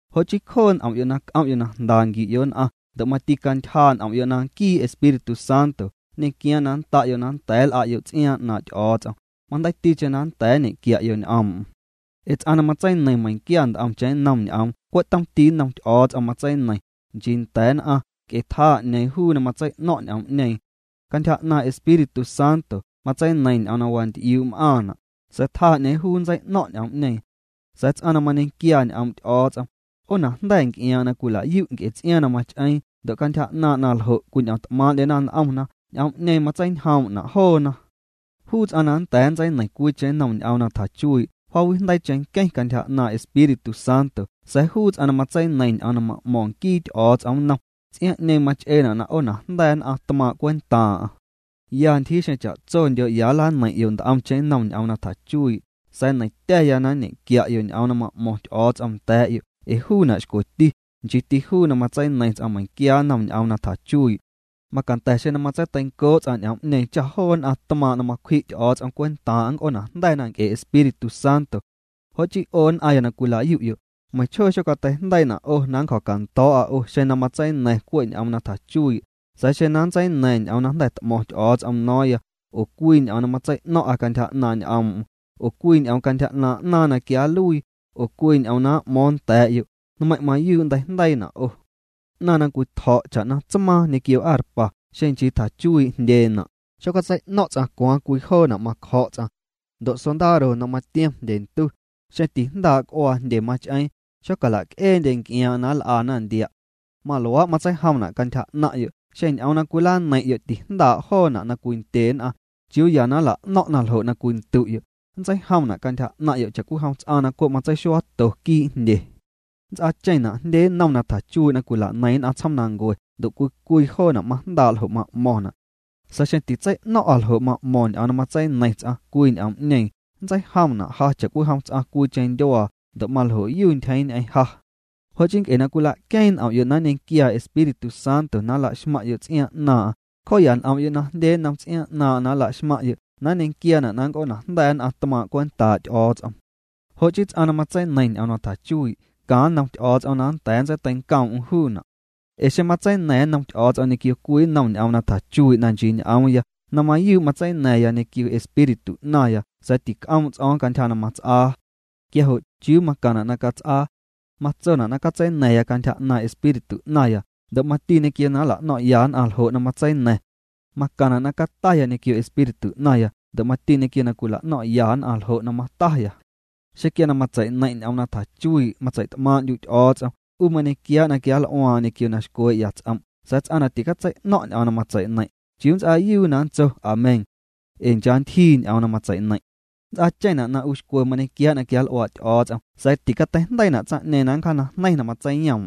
Jo' chii cjoo' n'om'yo' na c'om'yo' na jnda nquiu'yo' nn'aⁿ ndo' mati cantyjaa' n'om'yo' na nquii Espíritu Santo nñequiaaⁿ na nnda'yo' na nnda̱a̱ nl'a'yo' ts'iaaⁿ 'naaⁿ' Ty'o̱o̱ts'om, majndeiiticheⁿ na nnda̱a̱ nñequia'yo' ñ'oom'm. Ee ts'aⁿ na matseineiⁿ meiⁿnquia nt'omcheⁿ nnom ñ'oom cwe' tomti nnom Ty'o̱o̱ts'om matseineiⁿ, nchii nda̱a̱ nn'aⁿ nc'e tjaa 'ñeeⁿ juu na matsei'no̱ⁿ' ñ'oom'ñeeⁿ. Cantyja 'naaⁿ' Espíritu Santo matseineiⁿ ñ'oom na wanty'iuu' m'aaⁿna', sa̱a̱ tjaa 'ñeeⁿ juu nntsei'no̱ⁿ' ñ'oom'ñeeⁿ. Sa̱a̱ ts'aⁿ na mañequiaa ñ'oom' Ty'o̱o̱ts'om, 'oonajnda̱ nc'iaaⁿ'aⁿ na cwilayu' nc'e ts'iaaⁿ na mach'eeⁿ ndo' cantyja 'naaⁿ' na ljo' cwiñ'omt'maaⁿ'ndyena n'omna, ñ'oom'ñeeⁿ matseinjoom'na' joona. Juu ts'aⁿ na nnda̱a̱ nntseineiⁿ cwiicheⁿ nnom ñ'oom na tjachuii', jaawijndeii cheⁿnqueⁿ cantyja 'naaⁿ' Espíritu Santo sa̱a̱ juu ts'aⁿ na matseineiⁿ ñ'oom na ma'mo̱ⁿ nquii Ty'o̱o̱ts'om nnom, ts'iaaⁿ'ñeeⁿ mach'eena' na 'oonajnda̱ nn'aⁿ tmaaⁿ' cwentaaⁿ'aⁿ. Ya ntyjii xeⁿ cha'tsondyo' ya nlaneiⁿ'yo' nt'omcheⁿ nnom ñ'oom na tjachuii' sa̱a̱ neiⁿtya̱ya na nñe'quia'yo' ñ'oom na ma'mo̱ⁿ Ty'o̱o̱ts'om nda̱a̱'yo' ee juuna' xcweti, nchiiti juu na matseineiⁿ ts'aⁿ meiⁿnquia nnom ñ'oom na tjachuii'. Macanda̱ xeⁿ na matseiteincoo' ts'aⁿ ñ'oom'ñeeⁿ cha joo nn'aⁿ tmaaⁿ' na macwji' Ty'o̱o̱ts'om cwentaaⁿ'aⁿ nnc'oonajnda̱na nc'e Espíritu Santo. Jo' chii 'o nn'aⁿya na cwilayu'yo', meiⁿchjoo xocateijndeiina' 'o na nncjo̱cando̱o̱'a 'o xeⁿ na matseina̱ⁿ cwe' ñ'oom na tjachuii', sa̱a̱ xeⁿ na nntseina̱ⁿya ñ'oom na jnda̱ t'mo̱ⁿ Ty'o̱o̱ts'om no̱o̱ⁿya, oo cwii ñ'oom na matsei'ño̱ⁿ'a cantyja 'naaⁿ' ñ'oom'm, oo cwii ñ'oom cantyja 'naaⁿ' 'naaⁿ na quia nluii, oo cwii ñ'oom na m'mo̱o̱ⁿ nda̱a̱'yo', nmeiⁿ' mayuu' nnteijndeiina' 'o. 'Naⁿ na cwitjo̱' cha'na tsmaaⁿ ñequio arpa, xeⁿ nchii tjachuii' jndyeena', xotsei'ño̱ⁿ' ts'aⁿ cwaaⁿ cwii joona' macjo̱' ts'aⁿ. Ndo' sondaro na matiom jndye ntu, xeⁿ tijndaa' c'uaa jndye mach'eeⁿ, tixocala'c'eendye nc'iaaⁿ'aⁿ na nl'ana ndia'. Maluaa' matseijomna' cantyja 'naⁿ'yo', xeⁿ ñ'oom na cwilaneiⁿ'yo' tijndaa' joona' na cwindye nn'aⁿ, ¿chiuuya na nla'no̱ⁿ'na ljo' na cwindu'yo? Nntseijomna' cantyja 'naⁿ'yo' cha'cwijom ts'aⁿ cwe' matseixuaato quii' jndye. Nnts'aacheⁿna' jndye nnom na tjachuii' na cwila'neiⁿ nn'aⁿ tsjoomnancue, ndo' cwii cwii joona' majndaa' ljo' ma'mo̱ⁿna'. Sa̱a̱ xeⁿ titsei'no̱ⁿ'a ljo' ma'mo̱ⁿ ñ'oom na matseineiⁿ ts'aⁿ cwii ñ'oom'ñeeⁿ, nntseijomna' ja cha'cwijom ts'aⁿ cwiicheⁿ ndyuaa ndo' maljo'yu ntyjeeⁿ ñ'eⁿ ja. Jo' chii nc'e na cwila'queeⁿ n'om'yo' na nñequiaa Espíritu Santo na nlaxmaⁿ'yo' ts'iaaⁿ 'naaⁿ'aⁿ, cjoo'ya n'om'yo' na jndye nnom ts'iaaⁿ 'naaⁿ'aⁿ na nla'xmaⁿ'yo' na nñequiaana' na nnc'oonajnda̱nn'aⁿ tmaaⁿ' cwentaa' Ty'o̱o̱ts'om. Jo' chii ts'aⁿ na matseineiⁿ ñ'oom na tjachuii', caⁿ nnom Ty'o̱o̱ts'om na nnda̱a̱ nntseiteincoom'm juuna'. Ee xeⁿ matseina̱ⁿ nnom Ty'o̱o̱ts'om ñequio cwii nnom ñ'oom na tjachuii' na nchii ñ'oomya, na mayuu' matseina̱ⁿya ñequio espíritu 'naⁿya sa̱a̱ tic'oom' ts'o̱o̱ⁿ cantyja na mats'aa. Quia jo' ¿chiuu macaⁿna' na cats'aa? Matsona' na catseina̱ⁿya cantyja 'naaⁿ' espíritu 'naⁿya ndo' mati ñequio na nla'no̱ⁿ'ya nn'aⁿ ljo' na matseina̱ⁿ. Macaⁿna' na cataya ñequio espíritu 'naⁿya ndo' mati ñequio na cwila'no̱ⁿ'ya nn'aⁿ ljo' na mataya. Xeⁿ quia na matseineiⁿ' ñ'oom na tjachuii' matseit'maaⁿ'ndyu' Ty'o̱o̱ts'om, 'u mañequiaa' na quianl'uaaⁿ'aⁿ ñequio na xcwee'ya ts'om', sa̱a̱ ts'aⁿ na ticatsei'no̱ⁿ' ñ'oom na matseineiⁿ', ¿chiuu nnts'aayuu na nntso Amén? ee cha ntyjii ñ'oom na matseineiⁿ'. Nnts'aacheⁿna' na 'u xcwe mañequiaa' na quianl'uaa' Ty'o̱o̱ts'om sa̱a̱ ticateijndeiina' tsaⁿ'ñeeⁿ na nncjaanajneiⁿ na matseiyoom'm.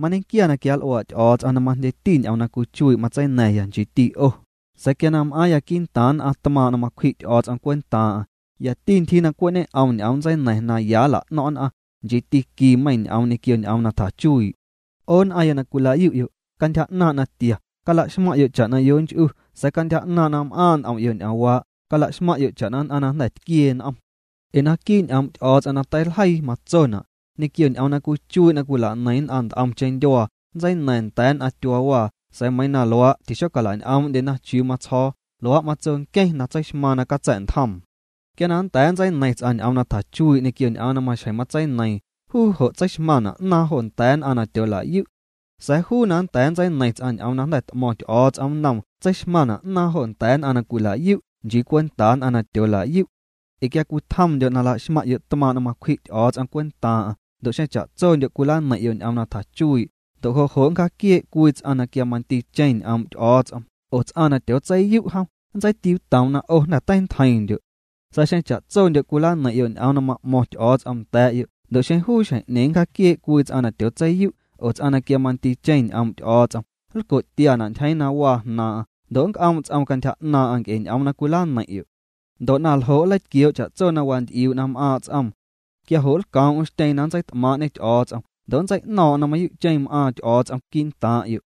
Mañequia na quianl'uaa' Ty'o̱o̱ts'om na majndyeti ñ'oom na cwichuii' matseina̱ⁿya, nchiiti 'o, sa̱a̱ quia na m'aaⁿya quii'ntaaⁿ nn'aⁿ tmaaⁿ' na macwji Ty'o̱o̱ts'om cwentaaⁿ'aⁿ, yati ntyjii na cwe' ñe'om ñ'oom nntseina̱ⁿ na ya nla'no̱ⁿ' nn'aⁿ, nchiiti quii meiiⁿ ñ'oom ñequio ñ'oom na tjachuii'. 'O nn'aⁿya na cwilayu'yo', cantyja 'naaⁿ' natia, cala'xmaⁿ'yo' cha'na yonch'u sa̱a̱ cantyja 'naaⁿ' na m'aaⁿ' n'om'yo' ñ'oomwaa', cala'xmaⁿ'yo' cha'na nn'aⁿ na jnda̱ tquiee n'om. Ee naquii' ñ'oom' Ty'o̱o̱ts'om na teiljeii matsona': “Ñequio ñ'oom na cwichuii' na cwila'neiⁿ nn'aⁿ nt'omcheⁿ ndyuaa nntseina̱ⁿya nda̱a̱ nn'aⁿ tyuaawaa sa̱a̱ meiiⁿ na luaa' tixocala'ñ'oom'ndyena chiuu matsjo̱o̱”, luaa' matso nqueⁿ na tseixmaaⁿ na catsa̱'ntjoom. Quia na nnda̱a̱ nntseineiⁿ ts'aⁿ ñ'oom na tjachuii' ñequio ñ'oom na maxjeⁿ matseineiiⁿ, juu jo' tseixmaⁿna' 'naaⁿ jo nda̱a̱ nn'aⁿ na tyoola'yu'. Sa̱a̱ juu na nnda̱a̱ nntseineiⁿ ts'aⁿ ñ'oom na jnda̱ t'mo̱ⁿ Ty'o̱o̱ts'om nnoom tseixmaⁿna' 'naaⁿ jo nda̱a̱ nn'aⁿ na cwila'yu', nchii cwentaa nn'aⁿ na tyoola'yu'. Ee quia cwitjomndyo' na laxmaⁿ'yo' tmaaⁿ' na macwji' Ty'o̱o̱ts'om cwentaaⁿ'aⁿ, ndo' xeⁿ cha'tsondyo' cwilaneiⁿ'yo' ñ'oom na tjachuii', ndo' jo' jo' nncjaquiee' cwii ts'aⁿ na quia mandiicheⁿ ñ'oom' Ty'o̱o̱ts'om oo ts'aⁿ na tyootseiyu' jom, nntseitiuutoom na 'o jnda̱ teintjeiⁿndyo'. Sa̱a̱ xeⁿ cha'tsondyo' cwilaneiⁿ'yo' ñ'oom na ma'mo̱ⁿ Ty'o̱o̱ts'om nda̱a̱'yo' ndo' xeⁿ juu xjeⁿ'ñeeⁿ nncjaquiee' cwii ts'aⁿ na tyootseiyu' oo ts'aⁿ na quia mandiicheⁿ ñ'oom' Ty'o̱o̱ts'om, nlco'tiana' ntyjeeⁿ na waa jnaaⁿ'aⁿ ndo' nnc'oom' ts'oom cantyja 'naaⁿ'aⁿ nc'e ñ'oom na cwilaneiⁿ'yo'. Ndo' na ljo' nleitquioo' cha'tso na wanty'iuu' na m'aaⁿ' ts'oom. Quia jo' lcoom'm xtyeeⁿ na nntseit'maaⁿ'ñê Ty'o̱o̱ts'om ndo' nntsei'no̱o̱ⁿ'o̱ⁿ na mayuu'cheⁿ m'aaⁿ Ty'o̱o̱ts'om quii'ntaaⁿ'yo'.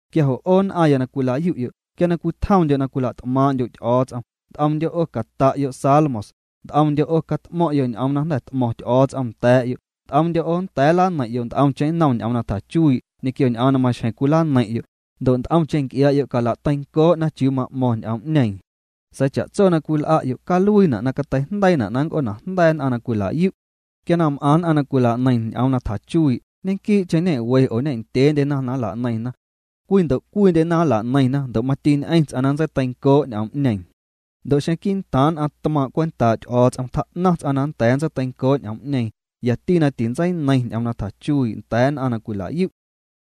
Quia jo' 'o nn'aⁿya na cwila'yu'yo' quia cwitjomndyo' na cwila't'maaⁿ'ndyo' Ty'o̱o̱ts'om, nt'omndyo' 'o cata'yo' salmos, nt'omndyo' 'o cat'mo̱ⁿ'yo' ñ'oom na jnda̱ t'mo̱ⁿ Ty'o̱o̱ts'om nda̱a̱'yo', nt'omndyo' 'o nda̱a̱ nlaneiⁿ'yo' nt'omcheⁿ nnom ñ'oom na tjachuii' ñequio ñ'oom na maxjeⁿ cwilaneiⁿ'yo', ndo' nt'omcheⁿ nc'iaa'yo' cala'teincoo'na chiuu cwit'mo̱o̱ⁿ n'oom'ñeeⁿ. Sa̱a̱ cha'tso na cwil'a'yo' caluiina' na cateijndeiina' na nnc'oonajnda̱ nn'aⁿ na cwila'yu'. Quia na m'aⁿ nn'aⁿ na cwila'neiⁿ ñ'oom na tjachuii', ñequii'cheⁿ ñe'we oo ndyeendyena na nla'neiⁿna. Cwii ndo' cwiindyena nla'neiⁿna ndo' mati ñ'eⁿ ts'aⁿ na nntseiteincoo' ñ'oom'ñeeⁿ. Ndo' xeⁿ quii'ntaaⁿ nn'aⁿ tmaaⁿ' cwentaa' Ty'o̱o̱ts'om tjaa'naⁿ ts'aⁿ na nnda̱a̱ ntseiteincoo' ñ'oom'ñeeⁿ, yati na tintseineiⁿ ñ'oom na tjachuii' nda̱a̱ nn'aⁿ na cwila'yu'.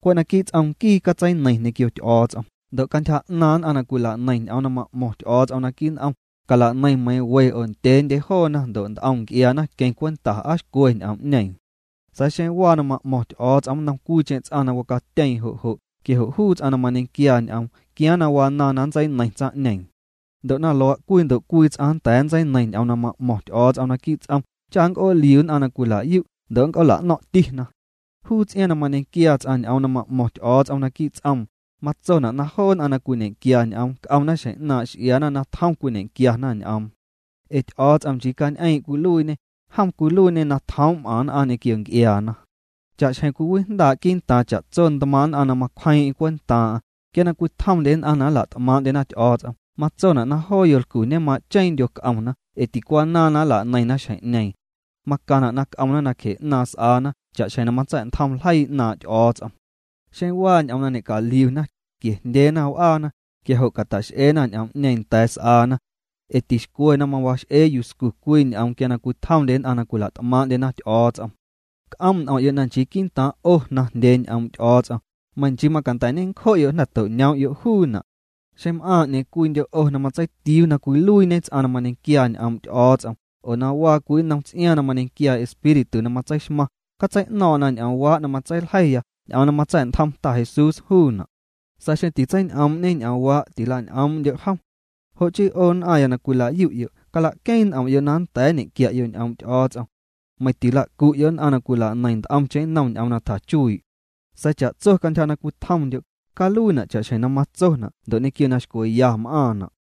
Cwe' naquii' ts'om nquii catseineiⁿ ñequio Ty'o̱o̱ts'om. Ndo' cantyja 'naaⁿ nn'aⁿ na cwila'neiⁿ ñ'oom na ma'mo̱ⁿ Ty'o̱o̱ts'om naquii' n'om, cala'neiⁿ meiiⁿ we oo ndyeendye joona ndo' nt'om nc'iaana queⁿ cwenta aa xcwe n'oom'ñeeⁿ. Sa̱a̱ xeⁿ waa na m'mo̱ⁿ Ty'o̱o̱ts'om nnom cwiicheⁿ ts'aⁿ na wacatyeeⁿ jo' jo', quia jo' juu ts'aⁿ na mañequiaa ñ'oom quiaaⁿ na wanaaⁿ na nntseineiⁿ tsaⁿ'ñeeⁿ. Ndo' na luaa' cwii ndo' cwii ts'aⁿ nnda̱a̱ nntseineiⁿ ñ'oom na ma'mo̱ⁿ Ty'o̱o̱ts'om naquii' ts'om cha nnc'ooliu nn'aⁿ na cwila'yu' ndo' nnc'oola'no̱ⁿ'tina. Juu ts'iaaⁿ na mañequiaa ts'aⁿ ñ'oom na ma'mo̱ⁿ Ty'o̱o̱ts'om naquii' ts'oom, matsona' na joo nn'aⁿ na cwiñequiaa ñ'oom c'omna xjeⁿ 'naaⁿ' x'iaana na tjom cwiñequiana ñ'oom. Ee Ty'o̱o̱ts'om nchii cañ'eeⁿ' cwiluiiñê, jom cwiluiiñê na tjoom' m'aⁿ nn'aⁿ ñequio nc'iaana. Cha'xjeⁿ cwiwijndaa' quii'ntaaⁿ cha'tso ntmaaⁿ' nn'aⁿ na macwjeeⁿ'eⁿ cwentaaⁿ'aⁿ, quia na cwitjomndye nn'aⁿ na nla't'maaⁿ'ndyena Ty'o̱o̱ts'om, matsona' na joo yolcu ñema'cheeⁿndyo c'omna ee ticwanaaⁿ na nla'neiⁿna xjeⁿ'ñeeⁿ. Macaⁿna' na c'omna nacje 'naaⁿ s'aana cha'xjeⁿ na matsa̱'ntjom ljeii 'naaⁿ' Ty'o̱o̱ts'om. Xeⁿ waa ñ'oom na ñe'caliuna, quiejndyeena w'aana, quia jo' cata'x'ena ñ'oom'ñeeⁿ nda̱a̱ s'aana. Ee tixcwe na mawax'ee yuscu cwii ñ'oom quia cwitjomndye nn'aⁿ na cwila't'maaⁿ'ndyena Ty'o̱o̱ts'om. C'oom' n'om'yo' na nchii quii'ntaaⁿ' 'o jnaⁿjndyee ñ'oom' Ty'o̱o̱ts'om, meiⁿ nchii macanda̱ ñencjo'yo' na jnda̱ to'ñoom'yo' juuna'. Xeⁿ m'aaⁿ 'ñeeⁿ cwiindyo' 'o na matseitiuu na cwiluiiñe ts'aⁿ na mañequiaa ñ'oom' Ty'o̱o̱ts'om oo na waa cwii nnom ts'iaaⁿ na mañequiaa Espíritu na matseixmaⁿ, catsei'no̱o̱ⁿ'o̱ⁿ na ñ'oomwaa' na matseiljeiya, ñ'oom na matsa̱'ntjom Ta Jesús juuna'. Sa̱a̱ xeⁿ titseiñ'oom'ñe ñ'oomwaa', tila'ñ'oom'ndyo' jom. Jo' chii 'o nn'aⁿya na cwila'yu', cala'queeⁿ n'om'yo' na nnda̱a̱ nñequia'yo' ñ'oom' Ty'o̱o̱ts'om. Meiⁿ ticala'cu'yo' nn'aⁿ na cwila'neiⁿ nt'omcheⁿ nnom ñ'oom na tjachuii'. Sa̱a̱ cha'tso cantyja na cwitjomndyo', caluiina' cha'xjeⁿ na matsona' ndo' ñequio na xcweya m'aaⁿna'.